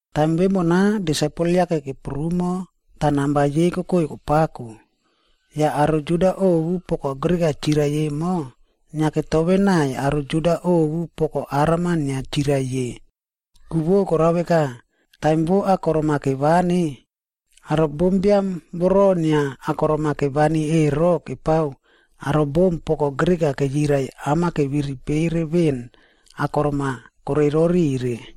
Taim vemona, disaipel-a yake keprumoa tah namba yei kokoi kopako. Yah aro Juda ovu poko Grik-a chirai emo, inia ketovenaiy aro Juda ovu poko Aram inia chirai ye.b Ku vo korao veka, taim vo akorom-a kevani, aro bombiam voro inia akorom-a kevani ero kepao aro bom poko Grik-a keyirai am-a keviripere veꞌen akorom-a koreirorire.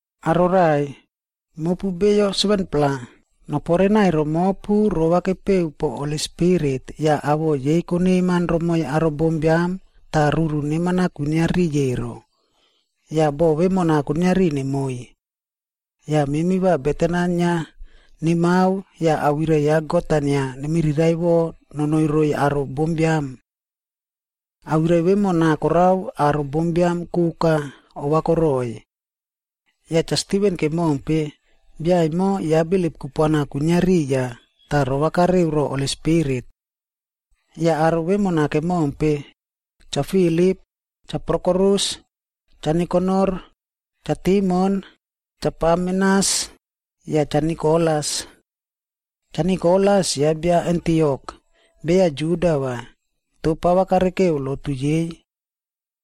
Aro raꞌai, mopu beyo 7-pla noporenai romopu rovakepeu po Holi Spirit yah awoꞌo yei koneman romoi aro bombiam tah ruru neman-a kwinia riꞌiy ero. Yah boꞌo vemona kuiniari nemoiy. Yah memi va beten-a inia nemao yah awirai ya God-a inia nemiriraiꞌvo nonoi roiy aro bombiam.” Awirai vemona korao aro bombiam koka ovakoroiy. Yah Cha Stiven kemompe, bia emo ya bilip kupuana kwinia riya tah rovakareu ro Holi Spirit. Yah aro vemona kemompe, Cha Filip, Cha Prokorus, Cha Nikanor, Cha Timon, Cha Parmenas yah Cha Nikolas. Cha Nikolas ya bia Antiok, beya Juda vai, toh pava karekeu lotu yei.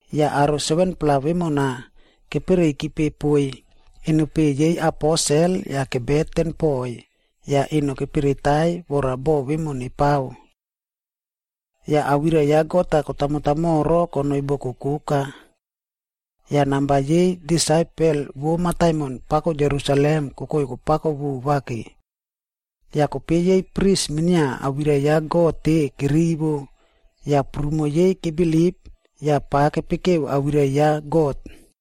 Yah aro 7-pla vemona kepereikipe poiy enopeꞌe yei aposel yah kebeten poiy yah eno neperetai vora boꞌo vemo nepao. Yah awirai ya God-a kotamotamoro konoi boko koka. Yah namba yei disaipel vo mataimon pako Jerusalem kokoi kopako vova ke. Yah kope yei pris minia awirai ya God-e kerivo, yah prumo yei kebilip yah pava kepekeu awirai ya God.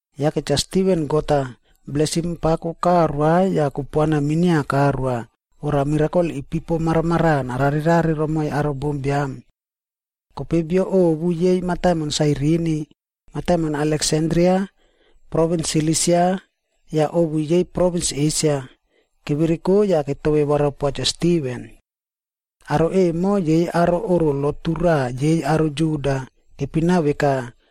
Yake Cha Stiven God-a blesim pako karoa yah kupuana minia karoa vora mirakol ipipo maramaraꞌa nararerare romoiy aro bombiam. Kope bio ovu yei mataimon Sairini, mataimon Aleksandria, provins Silisia yah ovu yei provins Esia, kevereko yah ketove warapoa Cha Stiven. Aro emo yei aro oꞌro lotu raꞌa yei aro Juda, kepina veka,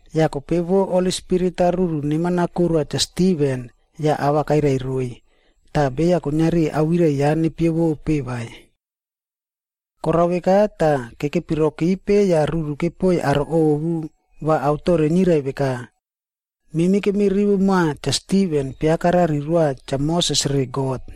Yah kope vo Holi Spirit-a ruru neman-a koroa Cha Stiven yah ava kairai roiy, tah beya kuiniari awirai ya nepievope vai. Korao veka tah, kekepirokipe yah ruru kepoiy aro ovu va aotore nirai veka, “Memi kemirivo moa Cha Stiven piakarari roa Cha Moses re God.”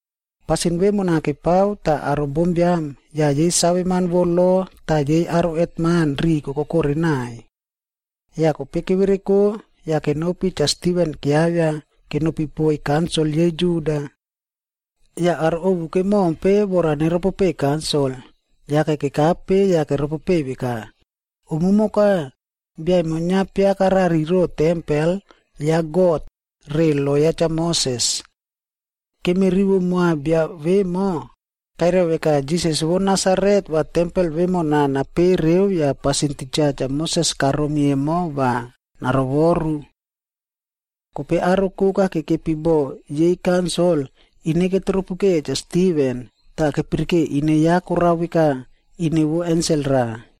Pasin vemona kepao tah aro bombiam, yah yei saveman vo lo tah yei aro hetman riꞌi kokokore naiy. Yah kope kevereko yah kenopi Cha Stiven kiavia kenopi poiy kaunsil yei Juda. Yah aro ovu kemompe vora neropopeiy kaunsil, yake kekape yah keropopeiy veka, “Umumoka, bia emo inia piakarari ro tempel ya God re lo ya Cha Moses. Kemirivo moa bia vemo kairai veka Jisas vo Nasaret va tempel vemona napereu yah pasin titja Cha Moses karomi emo va narovoru.” Kope aro koka kekepi bo yei kaunsil, ine ketropukeya Cha Stiven, tah kepirike ine ya korao veka ine vo ensel raꞌa.